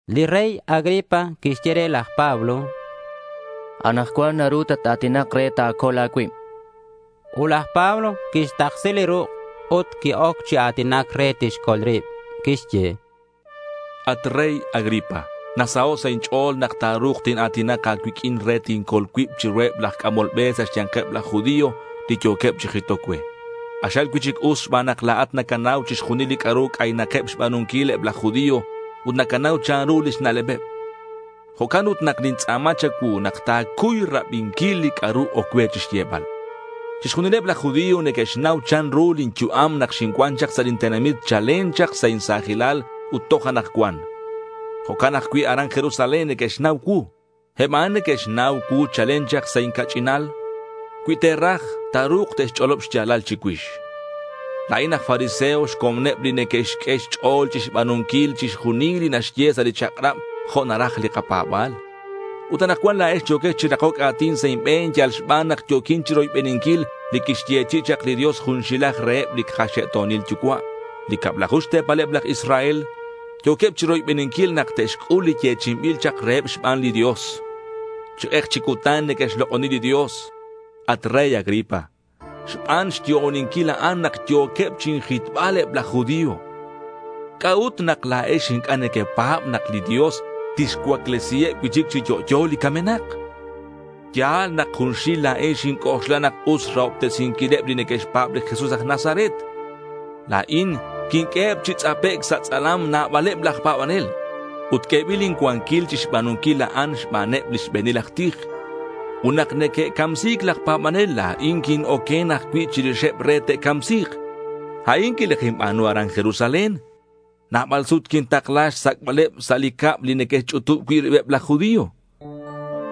Li rey Agripa quixye re laj Pablo: —Anakcuan naru tat-a̱tinak re ta̱col a̱cuib, chan. Ut laj Pablo quixtaksi li ruk' ut qui-oc chi a̱tinac re tixcol rib. Quixye: —At rey Agripa, nasaho' sa' inch'o̱l nak ta̱ru̱k tina̱tinak a̱cuiq'uin re tincol cuib chiruheb laj c'amol be sa' xya̱nkeb laj judío li yo̱queb chi jitoc cue. K'axal cui'chic us xban nak la̱at nacanau chixjunil li c'a'ru c'aynakeb xba̱nunquil eb laj judío ut nacanau chanru lix na'lebeb. Jo'can ut nak nintz'a̱ma cha̱cuu nak ta̱cuy rabinquil li c'a'ru oc cue xyebal. Chixjunileb laj judío neque'xnau chanru lin yu'am nak xincuan chak sa' lin tenamit chalen chak sa' insa̱jilal ut toj anakcuan. Jo'can ajcui' aran Jerusalén neque'xnau cuu. Eb a'an neque'xnau cuu chalen chak sa' inca'ch'inal. Cui te'raj, ta̱ru̱k te'xch'olob xya̱lal chicuix. La̱in aj fariseo xcomoneb li neque'xq'ue xch'o̱l chixba̱nunquil chixjunil li naxye sa' li chak'rab jo' naraj li kapa̱ba̱l. Ut anakcuan la̱ex yo̱quex chi rakoc a̱tin sa' inbe̱n yal xban nak yo̱quin chiroybeninquil li quixyechi'i chak li Dios junxilaj reheb li kaxe'to̱nil yucua'. Li cablaju xte̱paleb laj Israel yo̱queb chiroybeninquil nak te'xc'ul li yechi'inbil chak reheb xban li Dios. Chi k'ek chi cutan neque'xlok'oni li Dios. At rey Agripa, xban xyo'oninquil a'an nak yo̱queb chinjitbal eb laj judío. ¿C'a'ut nak la̱ex inc'a' nequepa̱b nak li Dios tixcuaclesiheb cui'chic chi yo'yo li camenak? Ya̱l nak junxil la̱in xinc'oxla nak us xrahobtesinquileb li neque'xpa̱b li Jesús aj Nazaret. La̱in quinq'ueheb chi tz'apec' sa' tz'alam nabaleb laj pa̱banel. Ut q'uebil incuanquil chixba̱nunquil a'an xbaneb li xbe̱nil aj tij. Ut nak neque'camsi̱c laj pa̱banel, la̱in quin-oquen ajcui' chirixeb re te'camsi̱k. A'in quilajinba̱nu aran Jerusalén. Nabal sut quintakla xsac'baleb sa' li cab li neque'xch'utub cui' ribeb laj judío.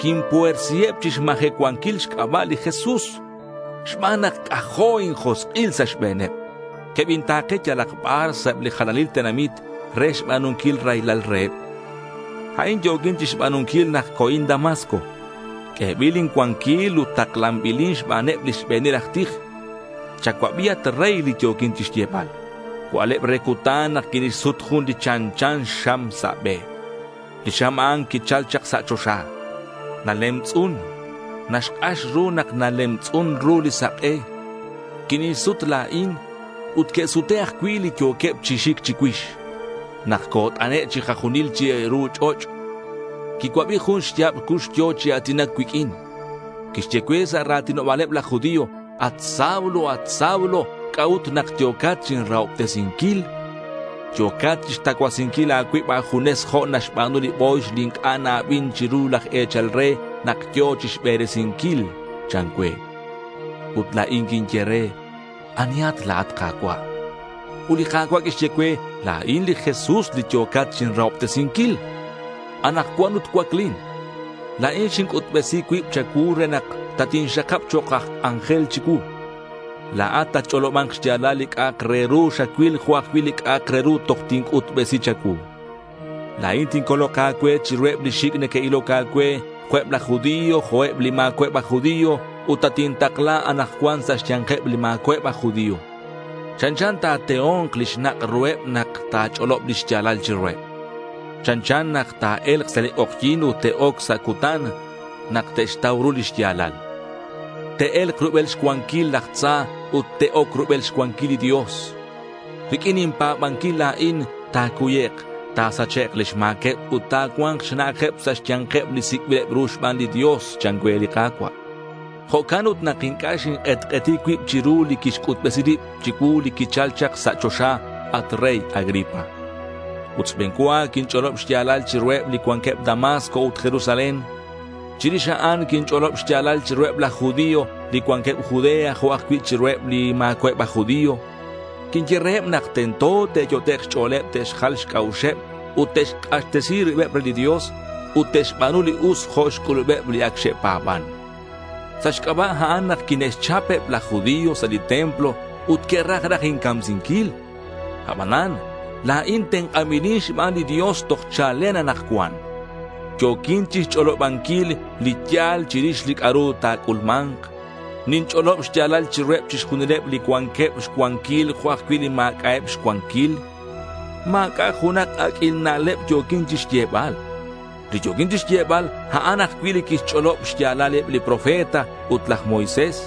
Quinpuersiheb chixmajecuanquil xc'aba' li Jesús. Xban nak c'ajo' injosk'il sa' xbe̱neb, quebinta̱ke yalak bar sa' eb li jalanil tenamit re xba̱nunquil raylal reheb. A'in yo̱quin chixba̱nunquil nak co̱in Damasco. Q'uebil incuanquil ut taklanbilin xbaneb li xbe̱nil aj tij. Chacuabi at rey, li yo̱quin xyebal. Cua'leb re cutan nak quinixsut jun li chanchan xam sa' be. Li xam a'an quichal chak sa' choxa. Nalemtz'un. Naxk'ax ru nak nalemtz'un ru li sak'e. Quinixsut la̱in ut que'sute' ajcui' li yo̱queb chi xic chicuix. Nak cot'ane' chikajunil chiru ch'och', quicuabi jun xya̱b cux yo̱ chi a̱tinac cuiq'uin. Quixye cue sa' ra̱tinoba̱leb laj judío, “At Saulo, at Saulo, ¿c'a'ut nak yo̱cat chinrahobtesinquil? Yo̱cat chixtacuasinquil a̱cuib a̱junes jo' naxba̱nu li bo̱yx li inc'a' na-abin chiru laj e̱chal re nak yo̱ chixberesinquil,” chan cue. Ut la̱in quinye re, “¿Anihat la̱at, Ka̱cua'?” Ut li Ka̱cua' quixye cue, “La̱in li Jesús li yo̱cat chinrahobtesinquil. Anakcuan ut cuaclin. La̱in xinc'utbesi cuib cha̱cuu re nak tatinxakab chok' aj c'anjel chicuu. La̱at tatch'oloba̱nk xya̱lal li c'a'ak re ru xacuil jo' ajcui' li c'a'ak re ru toj tinc'utbesi cha̱cuu. La̱in tincolok a̱cue chiruheb li xic' neque'iloc a̱cue, jo' eb laj judío, jo' eb li ma̱cua'eb aj judío, ut tatintakla anakcuan sa' xya̱nkeb li ma̱cua'eb aj judío. Chanchan nak ta̱teo̱nk li xnak' ruheb nak ta̱ch'olob li xya̱lal chiruheb. Chanchan nak te'e̱lk sa' li k'ojyi̱n ut te'oc sa' cutan nak te'xtau ru li xya̱lal. Te'e̱lk rubel xcuanquil laj tza ut te'oc rubel xcuanquil li Dios. Riq'uin inpa̱banquil la̱in, ta̱cuyek' ta̱sachek' lix ma̱queb, ut ta̱cua̱nk xna'ajeb sa' xya̱nkeb li sic'bileb ru xban li Dios,” chan cue li Ka̱cua'. Jo'can ut nak inc'a' xink'etk'eti cuib chiru li quixc'utbesi rib chicuu li quichal chak sa' choxa, at rey Agripa. Ut xbe̱n cua quinch'olob xya̱lal chiruheb li cuanqueb Damasco ut Jerusalén. Chirix a'an quinch'olob xya̱lal chiruheb laj judío li cuanqueb Judea, jo' ajcui' chiruheb li ma̱cua'eb aj judío. Quinye reheb nak tento te'yot'ek' xch'o̱leb te'xjal xc'a'uxeb ut te'xk'axtesi ribeb re li Dios ut te'xba̱nu li us jo' xc'ulubeb li ac xe'pa̱ban. Sa' xc'aba' a'an nak quine'xchap eb laj judío sa' li templo ut que'raj raj incamsinquil. Abanan la̱in tenk'anbilin xban li Dios toj chalen anakcuan. Yo̱quin chixch'olobanquil li ya̱l chirix li c'a'ru ta̱c'ulma̱nk. Ninch'olob xya̱lal chiruheb chixjunileb, li cuanqueb xcuanquil jo' ajcui' li ma̱c'a'eb xcuanquil. Ma̱c'a' junak aq'uil na'leb yo̱quin chixyebal. Li yo̱quin chixyebal, a'an ajcui' li que'xch'olob xya̱lal eb li profeta ut laj Moisés.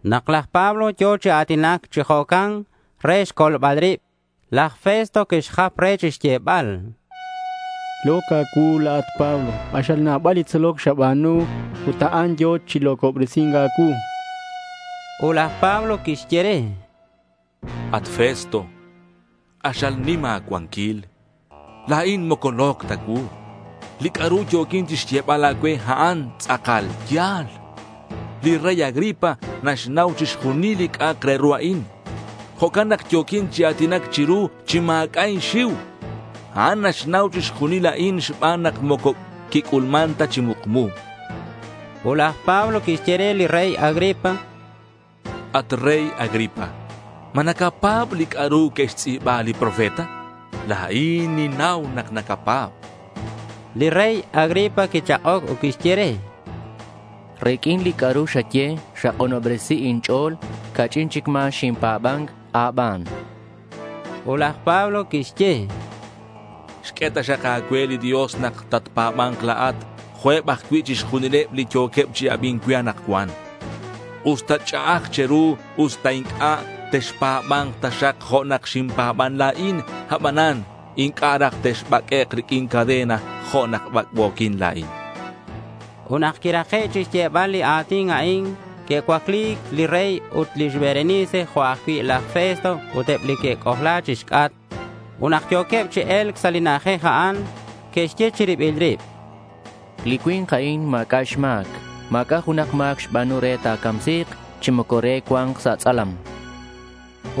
Nak laj Pablo yo̱ chi a̱tinac chi jo'can re xcolbal rib, laj Festo quixjap re chixyebal: —Lo̱c a̱cuu la̱at, Pablo. K'axal nabal li tzoloc xaba̱nu ut a'an yo̱ chi lo̱cobresi̱nc a̱cuu, chan. Ut laj Pablo quixye re: —At Festo, k'axal nim a̱cuanquil. La̱in moco lo̱c ta cuu. Li c'a'ru yo̱quin chixyebal a̱cue, a'an tz'akal ya̱l. Li rey Agripa naxnau chixjunil li c'a'ak re ru a'in. Jo'can nak yo̱quin chi a̱tinac chiru chi ma̱c'a' inxiu. A'an naxnau chixjunil a'in xban nak moco quic'ulman ta chi mukmu, chan. Ut laj Pablo quixye re li rey Agripa: —At rey Agripa, ¿ma nacapa̱b li c'a'ru que'xtz'i̱ba li profeta? La̱in ninnau nak nacapa̱b, chan laj Pablo. Li rey Agripa quichak'oc ut quixye re: —Riq'uin li c'a'ru xaye xak'unobresin inch'o̱l. Ca'ch'in chic ma̱ xinpa̱ban a̱ban, chan. Ut laj Pablo quixye: —Xq'ue taxak a̱cue li Dios nak tatpa̱ba̱nk la̱at jo' eb ajcui' chixjunileb li yo̱queb chi abi̱nc cue anakcuan. Usta ch'a'aj che̱ru, usta inc'a', texpa̱ba̱nk taxak jo' nak xinpa̱ban la̱in, abanan inc'a' raj texbaq'uek' riq'uin cadena, jo' nak bac'bo̱quin la̱in, chan. Ut nak quirake' chixyebal li a̱tin a'in, que'cuacli li rey ut lix Berenice jo' ajcui' laj Festo ut eb li que'c'ojla chixc'atk. Ut nak yo̱queb chi e̱lc sa' li na'ajej a'an, que'xye chi ribileb rib: —Li cui̱nk a'in ma̱c'a' xma̱c. Ma̱c'a' junak ma̱c xba̱nu re ta̱camsi̱k chi moco re cua̱nk sa' tz'alam, chanqueb.